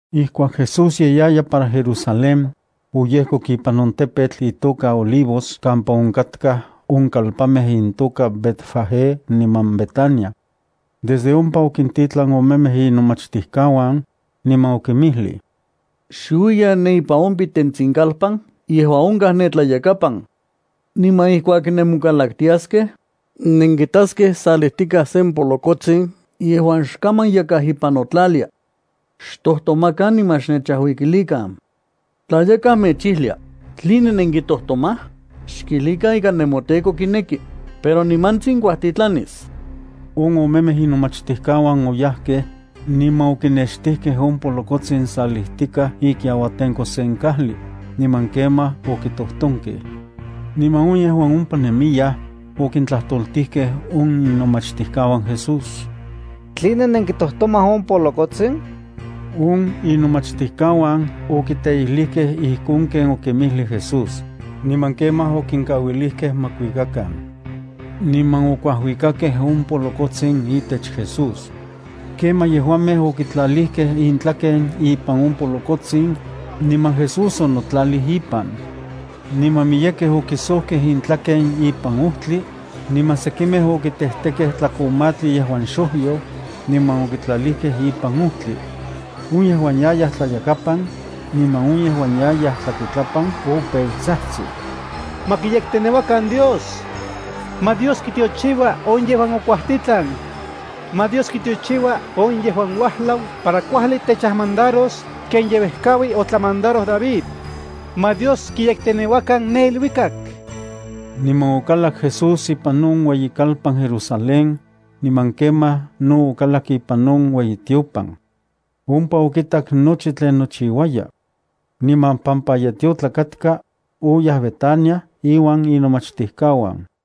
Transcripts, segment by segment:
Ijkuak Jesús ye yaya para Jerusalén, oyejkok ipan on tepetl itoka Olivos kampa onkatkaj on kalpanmej intoka Betfagé niman Betania. Desde ompa okintitlan omemej inomachtijkauan, niman okinmijlij: —Xuiyan ne ipan on pitentsin kalpan yejuan onkaj ne tlayakapan. Niman ijkuak nemonkalaktiaskej, nenkitaskej salijtikaj sen polokotsin yejuan xe kaman yakaj ipan notlalia. Xtojtomakan niman xnechajuikilikan. Tla yakaj mechijlia: “¿Tline nenkitojtomaj?”, xkijlikan ika nemoTEKO kineki, pero nimantsin kuajtitlanis. On omemej inomachtijkauan oyajkej, niman okinextijkej on polokotsin salijtikaj ikiauatenko sen kajli, niman kemaj okitojtonkej. Niman on yejuan ompa nemiyaj, okintlajtoltijkej on inomachtijkauan Jesús: —¿Tline nenkitojtomaj on polokotsin? On inomachtijkauan okiteijlijkej ijkon ken okinmijlij Jesús. Niman kemaj okinkauilijkej ma kuikakan. Niman okuajuikakej on polokotsin itech Jesús. Kemaj yejuamej okitlalijkej intlaken ipan on polokotsin, niman Jesús onotlalij ipan. Niman miyekej okisojkej intlaken ipan ojtli, niman sekimej okitejtekej tlakomatli yejuan xojyo, niman okitlalijkej ipan ojtli. On yejuan yayaj tlayakapan, niman on yejuan yayaj tlakuitlapan opeu tsajtsij: —¡Ma kiyekteneuakan Dios! ¡Ma Dios kitiochiua on yejuan okuajtitlan! ¡Ma Dios kitiochiua on yejuan uajlau para kuajli techajmandaros ken ye uejkaui otlamandaroj David! ¡Ma Dios kiyekteneuakan ne iluikak! Niman okalak Jesús ipan on ueyikalpan Jerusalén, niman kemaj no okalak ipan on ueyitiopan. Ompa okitak nochi tlen nochiuaya. Niman pampa ye tiotlak katka, oyaj Betania inuan inomachtijkauan.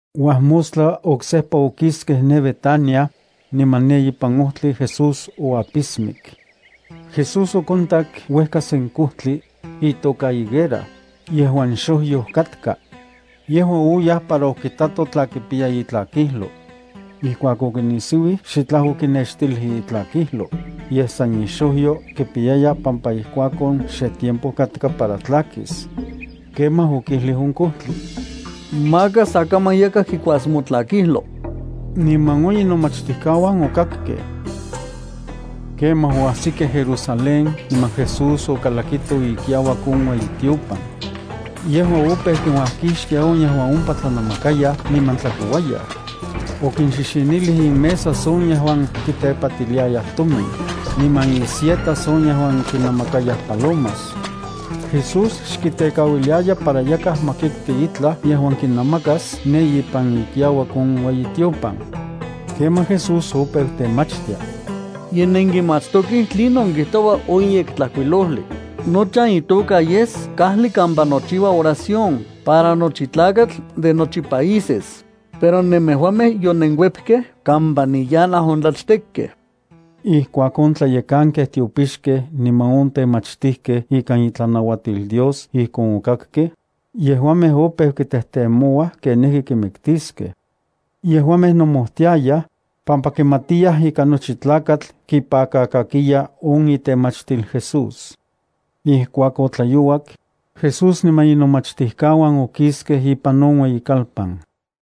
Uajmostla oksejpa okiskej ne Betania, niman ne ipan ojtli Jesús oapismik. Jesús okontak uejka sen kojtli, itoka higuera, yejuan xojyoj katka. Yejua oyaj para okitato tla kipiya itlakijlo. Ijkuak okinisiuij, xitlaj okinextilij itlakijlo, yej san ixojyo kipiyaya pampa ijkuakon xe tiempo katka para tlakis. Kemaj okijlij on kojtli: —Maka sa kaman yakaj kikuas motlakijlo. Niman on inomachtijkauan okakkej. Kemaj oajsikej Jerusalén niman Jesús okalakito ikiauak on ueyitiopan. Yejua opeu kinuajkixtia on yejuan ompa tlanamakayaj niman tlakouayaj. Okinxixinilij inmesas on yejuan kitepatiliayaj tomin, niman insietas on yejuan kinnamakayaj palomas. Jesús xkitekauiliaya para yakaj ma kikti itlaj yejuan kinamakas ne ipan ikiauak on ueyitiopan. Kemaj Jesús opeu temachtia: —Ye nenkimatstokej tlinon kijtoua in Yektlajkuilojli: “Nochan itoka yes kajli kampa nochiua oración para nochi tlakatl de nochi países”, pero nemejuamej yonenkuepkej kampa niyanaj on tlachtekkej. Ijkuak on tlayekankej tiopixkej niman on temachtijkej ikan itlanuatil Dios ijkon okakkej, yejuamej opeu kitejtemouaj kenijki kimiktiskej. Yejuamej nomojtiayaj, pampa kimatiyaj ika nochi tlakatl kipakakakiya on itemachtil Jesús. Ijkuak otlayouak, Jesús niman inomachtijkauan okiskej ipan on ueyikalpan.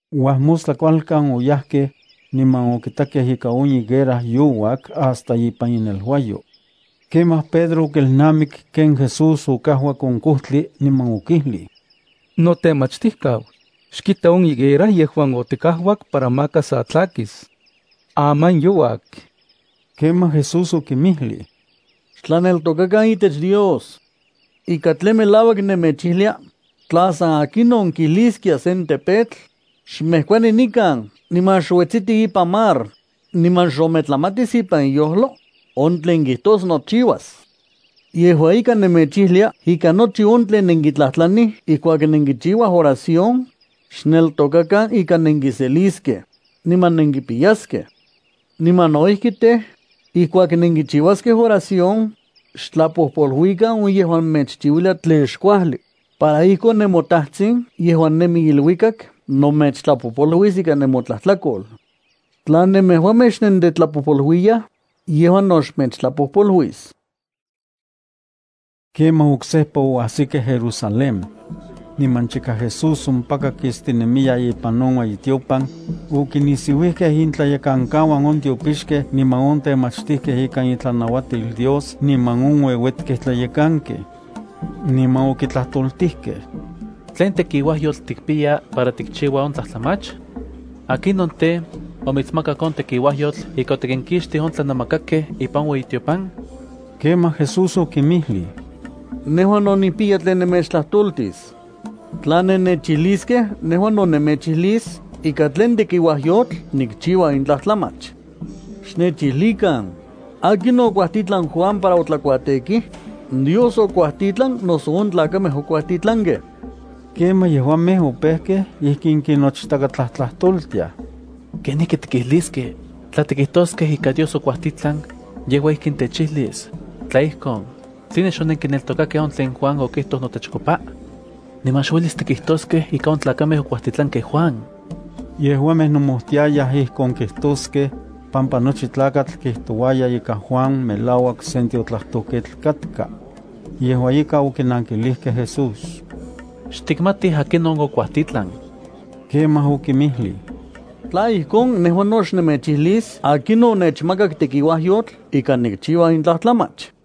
Uajmostla kualkan oyajkej, niman okitakej ika on higuera youak hasta ipan ineluayo. Kemaj Pedro okelnamik ken Jesús okajuak on kojtli, niman okijlij: —Notemachtijkau, xkita on higuera yejuan otikajuak para maka sa tlakis. Aman youak. Kemaj Jesús okinmijlij: —Xtlaneltokakan itech Dios. Ika tlen melauak nemechijlia, tla san akinon kijliskia sen tepetl: “Xmejkuani nikan niman xuetsiti ipan mar”, niman xometlamatis ipan iyojlo, on tlen kijtos nochiuas. Yejua ika nemechijlia ika nochi on tlen nenkitlajtlanij ijkuak nenkichiua oración, xneltokakan ika nenkiseliskej, niman nenkipiyaskej. Niman no ijki tej, ijkuak nenkichiuaskej oración, xtlapojpoluikan on yejuan mechchiuilia tlen xkuajli, para ijkon nemoTajtsin yejuan nemi iluikak no mechtlapojpoluis ika nemotlajtlakol. Tla nemejuamej xnentetlapojpoluiyaj, yejua no xmechtlapojpoluis. Kemaj oksejpa oajsikej Jerusalén. Niman chika Jesús ompaka kistinemiya ipan on ueyitiopan, okinisiuijkej intlayekankauan on tiopixkej niman on temachtijkej ikan itlanauatil Dios niman on ueuetkej tlayekankej. Niman okitlajtoltijkej: —¿Tlen tekiuajyotl tikpiya para tikchiua on tlajtlamach? ¿Akinon tej, omitsmakak on tekiuajyotl ika otikinkixtij on tlanamakakej ipan on ueyitiopan? Kemaj Jesús okinmijlij: —Nejua no nikpiya tlen nemechtlajtoltis. Tla nennechijliskej, nejua no nemechijlis ikan tlen tekiuajyotl nikchiua in tlajtlamach. Xnechijlikan, ¿akinon okuajtitlan Juan para otlakuatekij? ¿Dios okuajtitlan noso on tlakamej okuajtitlankej? Kemaj yejuamej opejkej ijkin kinochtakatlajtlajtoltiaj: —¿Kenijki tikijliskej? Tla tikijtoskej ika Dios okuajtitlan, yejua ijkin techijlis: “Tla ijkon, ¿tline xonenkineltokakej on tlen Juan okijtoj notechkopa?” Niman xuelis tikijtoskej ika on tlakamej okuajtitlankej Juan. (Yejuamej nomojtiayaj ijkon kijtoskej, pampa nochi tlakatl kijtouaya ika Juan melauak sen tiotlajtojketl katka.) Yejua ika okinankilijkej Jesús: —Xtikmatij akinon okuajtitlan. Kemaj okinmijlij: —Tla ijkon, nejua no xnemechijlis akinon onechmakak tekiuajyotl ika nikchiua in tlajtlamach.